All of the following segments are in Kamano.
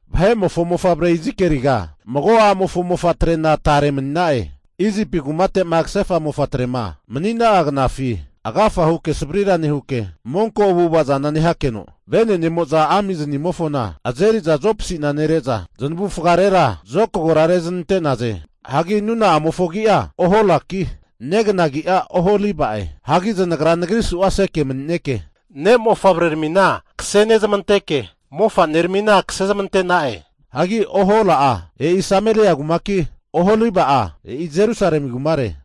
Vahe'mofo mofavre Izikieliga, mago a'mofo mofa'trena tare mani'na'e. Isipi kumate'ma kasefa mofa'trema mani'na'a knafi agafa huke savrira nehuke, monko avu'ava zana nehakeno vene'nemo'za amiznimofona azeri'za zopasi'na nere'za zanavufagarera zokagora rezanante'naze. Hagi nuna'amofo agi'a Oholaki, negana agi'a Oholiba'e. Hagi zanagra nagri su'aseke mani'neke ne' mofavreramina kasenezmanteke mofaneramina kasezmante'na'e. Hagi Ohola'a e'i Sameria kumaki, Oholiba'a e'i Jerusalemi kumare.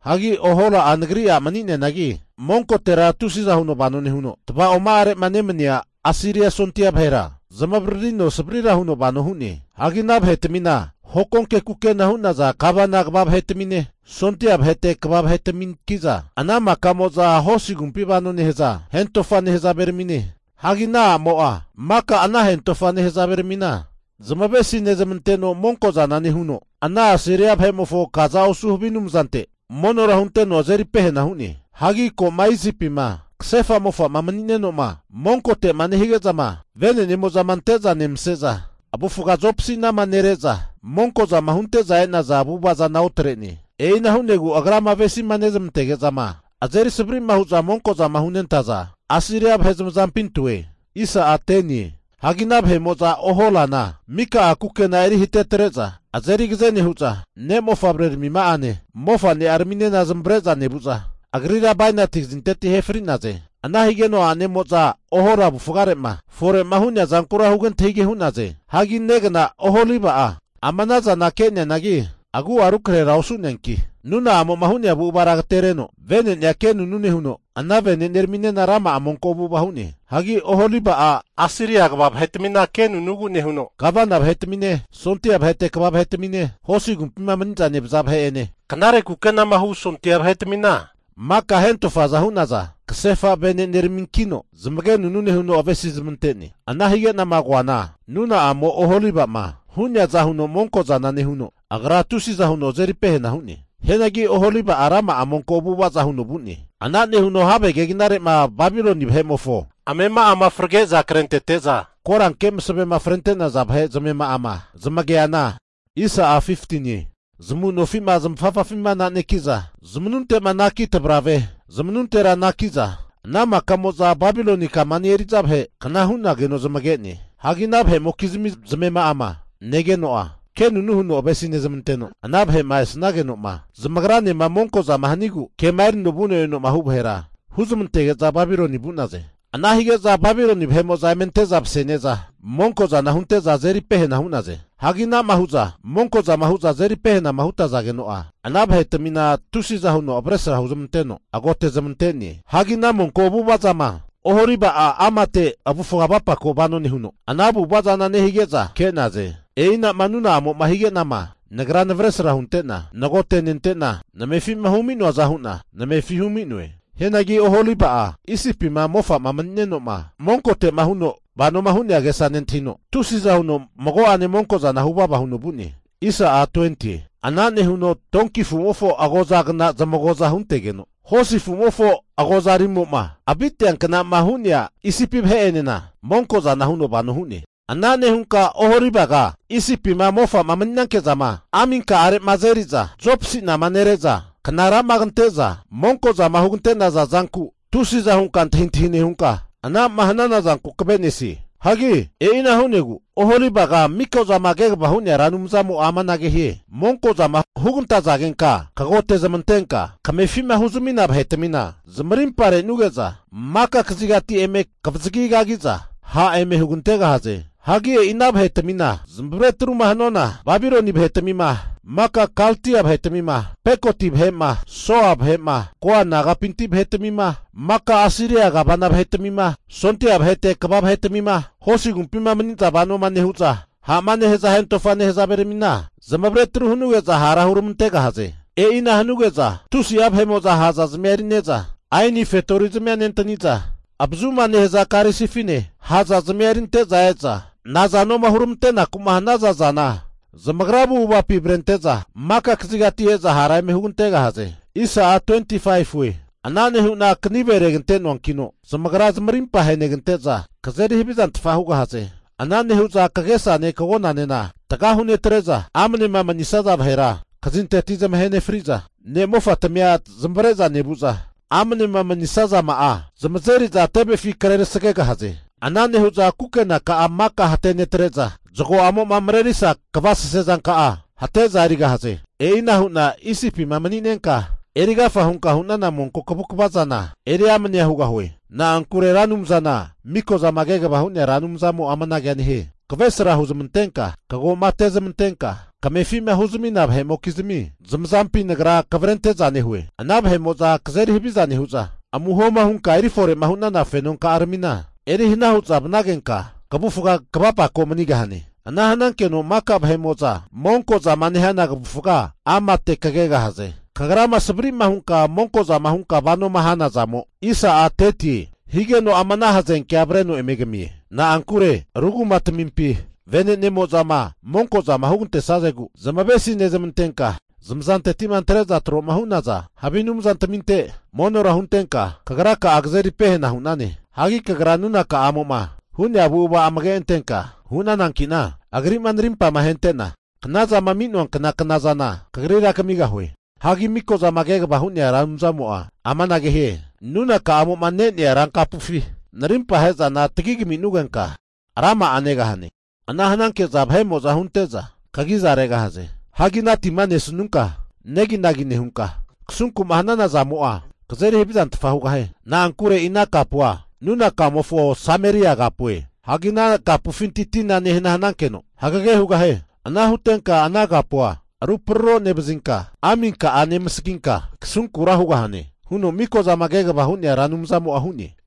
Hagi Ohola'a nagri a' mani'neanagi monkotera tusiza huno vano nehuno, tavaoma'arema nemania Asiria sondia vahera zamavaririno savarira huno vano hu'ne. Hagi ana vahetamina hokonke kukena hu'naza gavana kva vahetamine, sondia vahete kva vahetaminki'za ana makamo'za hosi agumpi vano nehaza hentofa nehazaveramine. Hagi ana a'mo'a maka ana hentofa nehazaveramina zamavesi nezmanteno monkozana nehuno, ana Asiria vahe'mofo kaza osu havi anumzante monora hunteno azeri pehena hu'ne. Hagi ko'ma Isipima kasefa mofa'ma mani'neno'ma monkote'ma nehige'zama, venenemo'zama ante'za nemase'za, avufaga zopasi'nama nere'za, monkozama hunte'za e'naza avu'ava zana otre'ne. E'ina hu'negu agrama avesima nezmantege'zama, azerisavari hu'za monko'zama hunentaza Asiria vahe zamazampi antoe. Hagi ana vahe'mo'za Oholana mika'a kukena'a eri hatetre'za azeri agaze nehu'za, ne' mofavreramima'ane mofane'araminena zamavare'za nevu'za, agrira bainati kazinteti ahe fri'naze. Ana higeno a'nemo'za Ohola avufare'ma fore'ma hu'nea zankura huge antahige hu'naze. Hagi negna Oholiba'a ama ana zana ke'neanagi, agu'a rukrahera osu'neanki, nuna'amo'ma hu'nea avu'avara agatereno vene'nea kenunu nehuno ana veneneraminena rama'a monko avu'ava hu'ne. Hagi Oholiba'a Asiria kva vahetamina ke anunu nehuno, gavana vahetamine, sondia vahete kva vahetamine, hosi agumpima maniza nevaza vahe'ene, knare kukenama hu sondia vahetamina maka hentofaza hu'naza kasefa veneneraminkino zamagenunu huno avesi'zmante'ne. Ana hige'nama koana nuna'amo Oholiba'ma hu'neaza huno monko'zana nehuno, agra'a tusiza huno azeri pehena hu'ne. Hianagi Oholiba'a rama'a monko avu'ava zana huno vu'ne. Ana nehuno have keginare'ma Babiloni vahe'mofo amema'ama frage'za krentete'za koranke masavema frente'naza vahe zamema'ama zamage'neana, zamu nofi'ma zamafafafima ananeki'za, zamanunte'ma anaki tavarave zmanuntera anaki'za, ana makamo'za Babiloni kamani eri'za vahe kna hu'nageno zamage'ne. Hagi ana vahe'mokizmi zamema'ama negeno'a, kenunu huno avesi nezmanteno, ana vahe'ma esanageno'ma zamagranema monkozama hanigu kema erino vuno eno'ma hu' vahera huzmantege'za Babiloni vu'naze. Ana hige'za Babiloni vahe'mo'za eme ante'za mase'ne'za monkozana hunte'za azeri pehena hu'naze. Hagi ana'ma hu'za monkozama hu'za azeri pehenama hutazageno'a, ana vahetamina tusiza huno avesra huzmanteno agote'zmante'ne. Hagi ana monko avu'ava zana Oholiba'a amate avufga avapako vano nehuno ana avu'ava zana nehige'za ke'naze. E'inama nuna'amo'ma higenama Nagra navesra hunte'na nagotenente'na namefi'ma humi'noaza hu'na namefi humi'noe. Hianagi Oholiba'a Isipima mofa'ma mani'neno'ma monkote'ma huno vanoma hu'nea agesa nentahino, tusiza huno mago'ane monkozana huvava huno vu'ne. Ana nehuno donki afu'mofo agozagna zamago'za huntegeno, hosi afu'mofo agozarimo'ma aviteankna'ma hu'nea Isipi vahe'enena monkozana huno vano hu'ne. Ana nehunka Oholibaga Isipima mofa'ma mani'nanke'zama aminka'arema azeriza, zopasi'nama nere'za knara'ma kante'za monkozama hugante'naza zanku tusiza hunka antahintahi nehunka, ana'ma hanana zanku kave'nesie. Hagi e'ina hu'negu Oholibaga Mikozama Kegavama Hu'nea Ra Anumzamo'a amanage hie, monkozama hugantazagenka kagote zamantenka kamefi'ma huzami'nana vahetamina zamarimpa re'nuge'za, maka kazigati eme kavazagi kagi'za ha' eme hugantegahaze. Hagi e'i ana vahetamina zamavare atruma hanuana, Babiloni vahetamima, maka Kaldia vahetamima, Pekodi vahe'ma, Soa vahe'ma, Koa nagapinti vahetamima, maka Asiria gavana vahetmima, sondia vahete kva vahetamima, hosi agumpima maniza vano nehu'za ha'ma nehaza hentofa nehazaveramina zamavare atru hanuge'za hara huramantegahaze. E'ina hanuge'za tusi'a vahe'mo'za ha'zazmia eri'neza aini fetori zamia nentaniza avazuma nehaza karisifine ha' zazmia erinte'za e'za nazanoma huramante'naku'ma hanaza zana zamagra avu'avapi avrente'za maka kazigati e'za hara eme hugantegahaze. Ana nehu'na kanive regante'noankino zamagra zamarimpa ahenegante'za kazeri havizantfa hugahaze. Ana nehu'za kagesane kagonanena taga hunetre'za, amanema manisaza vahera kazinteti zamahe nefri'za ne'mofatamia zamavare'za nevu'za, amnema manisazama'a zamazeri'za tevefi kre tasagegahaze. Ana nehu'za kukenaka'a maka hatenetre'za, zago'amo'ma marerisa kavasese zanka'a hate'za erigahaze. E'ina hu'na Isipima mani'nenka erigafa hunka hu'nana monko kavukava zana eri amanea hugahue. Na'ankure Ra Anumzana Miko'zama Kegava Hu'nea Ra Anumzamo'a amanagea hie. Kavresra hunezmantenka kago'ma ate'zmantenka kamefi'ma huzamina vahe'mokizmi zamazampi Nagra kavrente'za nehue. Ana vahe'mo'za kazeri haviza nehu'za, amuhoma hunka erifore'ma hunana fenonka'aramina eri hana hu'za vanagenka, kavufga kavapako manigahane. Ana hanankeno maka vahe'mo'za monko zama nehana kavufga amate kegahaze. Kagrama savri'ma hunka monko zama hunkama vano hanazamo, higeno ama ana hazenkea avreno eme kamie. Na'ankure ru kumatamimpi venenemo'zama monko zama hugantesazegu zamavesi nezmantenka, zamazanteti'ma antre'za tro'ma hu'naza havi anumzantaminte monora huntenka kagraka'a kazeri pehena hu'nane. Hagi kagra nunakamo'ma hu'nea avu'ava amage antenka hu'nananki'na, agri'ma narimpa ahente'na knazama ami'noankna knazana kagrira kamigahue. Hagi miko'zama kegavama hu'nea Ra Anumzamo'a amanage hie, Nunakamo'ma ne'nea rankapufi narimpa ahe'zana tagi kaminugenka rama'a negahane. Ana hananke'za vahe'mo'za hunte'za kagi'za regahaze. Hagi ana tima nesnunka neginagi nehunka, kasunku'ma hanana zamo'a kazeri havizantfa hugahie. Na'ankure e'i ana kapua nunakamofo Sameria kapue. Hagi ana kapufinti tina nehana hanankeno hagege hugahie. Ana hutenka ana kapua aru praro nevazinka aminka'a nemasaginka kasunkura hugahane huno Mikozama Kegava Hu'nea Ra Anumzamo'a hu'ne.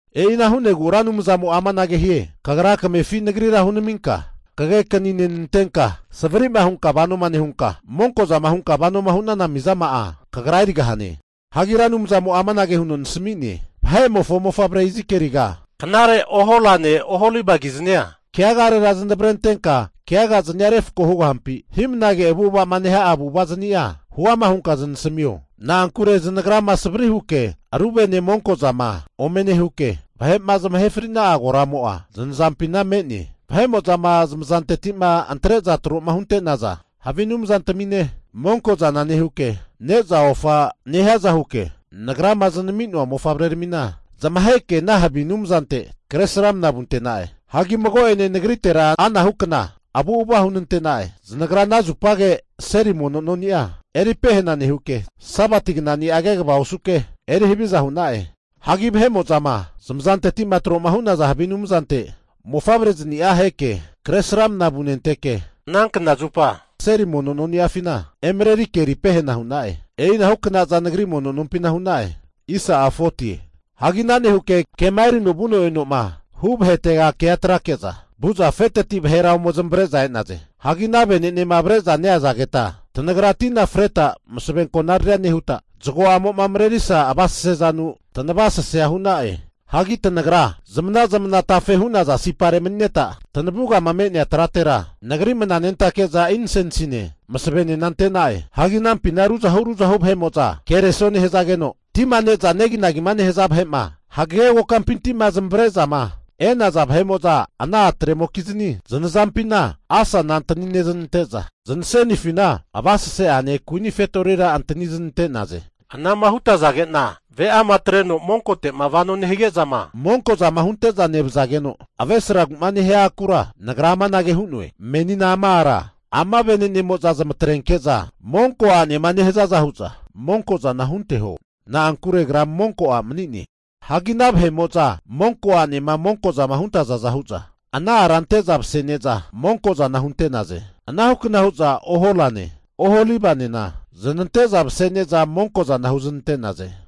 E'ina hu'negu Ra Anumzamo'a amanage hie, Kagra kamefi Nagrira hunaminka kagekani nenantenka, savri'ma hunka vano nehunka, monkozama hunka vanoma hu'nana mizama'a kagra erigahane. Hagi Ra Anumzamo'a amanage huno nasami'ne, Vahe'mofo mofavre Izikieliga, knare Oholane Oholibakiznia keagarera zanavrentenka keagaznia refko hugahampi? Hi'mnage avu'ava'ma neha'a avu'ava'znia huama hunka zanasamio. Na'ankure zanagrama savri huke ru vene monko zama ome nehuke, vahe'ma zamahe fri'na'a koramo'a zanazampina me'ne. Vahe'mozama zamazanteti'ma antre'za tro'ma hunte'naza havi anumzantamine monko zana nehuke, ne'za ofama nehiaza huke Nagrama zanami'noa mofavreramina zamaheke ana havi anumzante Kresramana vunte'na'e. Hagi mago'ene nagritera anahu kna avu'ava hunante'na'e. Zanagra ana zupage seli mono noni'a eri pehena nehuke, Sabati knani'a kegava osuke, eri haviza hu'na'e. Hagi vahe'mo'zama zamazanteti'ma tro'ma hu'naza havi anumzante mofavrezania aheke Kresramana vunenteke, anankna zupa seli mono noni'afina emarerike eri pehena hu'na'e. E'inahu knaza Nagri mono nompina hu'na'e. Hagi ana nehuke kema erino vuno eno'ma hu vahete kea atrake'za, vu'za afeteti vahera ome zamavare'za e'naze. Hagi ana vene'nema avre'za neazageta'a tanagra tina freta masave konariria nehuta, zago'amo'ma marerisa avasesezanu tanavasasea hu'na'e. Hagi tanagra zamana zamana tafe hu'naza sipare mani'neta, tanavugama me'nea tratera Nagri mananentake'za insensine masavenena ante'na'e. Hagi anampina ruzahu ruzahu vahe'mo'za kereso nehazageno, tima ne'za neginagima nehaza vahe'ma hagege kokampinti'ma zamavare'zama e'naza vahe'mo'za ana atre'mokizni zanazampina asana antani nezanante'za, zanasenifina avasese'ane kuini fetorira antani zanante'naze. Anama hutazage'na ve'ama atreno monkote'ma vano nehige'zama, monko zama hunte'za nevazageno avresragu'ma nehia akura nagra amanage hu'noe. Menina ama ara ama venenemo'za zamatrenke'za monko a'nema nehazaza hu'za monkozana hunteho. Na'ankure agra monko a' mani'ne. Hagi ana vahe'mo'za monko a'nema monko zama hunentazaza hu'za, ana ara ante'za mase'ne'za monko'zana hunte'naze. Ana hukna hu'za Oholane Oholibanena zanante'za mase'neza monko zana huznante'naze.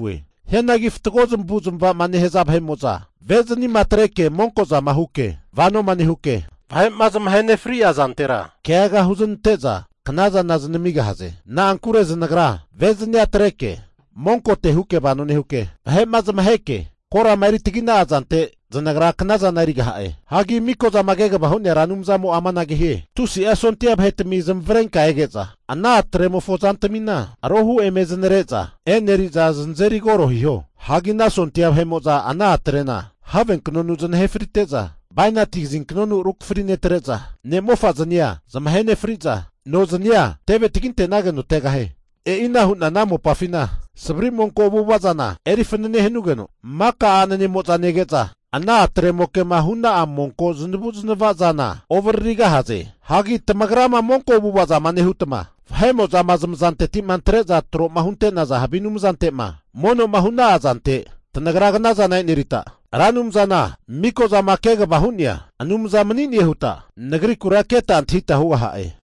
Hianagi fatgo zamavu'zmavama nehaza vahe'mo'za, ve'zanima atreke monko'zama huke vanoma nehuke vahe'ma zamahe nefri'a zantera keaga huznante'za knazana zanamigahaze. Na'ankure zanagra ve'zania atreke monkote huke vano nehuke, vahe'ma zamaheke korama eri tagina'a zante zanagra knazana erigaha'e. Hagi Miko'zama Kegavama Hu'nea Anumzamo'a amanage hie, tusi'a sondia vahetami zamavarenka ege'za, ana atre'mofo zantamina arohu eme zanare'za eneri'za zanazeri koro hiho. Hagi ana sondia vahe'mo'za ana a'trena havenknonu zanahe frite'za, bainati kazinknonu rukafri netre'za ne'mofazania zamahe nefri'za nozania teve taginte'nageno tegahie. E'ina hu'na ana mopafina savari monko avu'ava zana eri fanane hanugeno, maka a'nanemo'za nege'za ana a'tre'mokema hu'na'a monko zanavu'zanava zana ovaririgahaze. Hagi tanagrama monko avu'ava zama nehuta, vahe'mo'zama zamazanteti'ma antre'za tro'ma hunte'naza havi anumzante'ma mono'ma hu'na'a zante tanagra knazana e'nerita, Ra Anumzana Miko'zama Kegavama Hu'nea Anumza mani'ne huta Nagrikura keta antahita hugaha'e.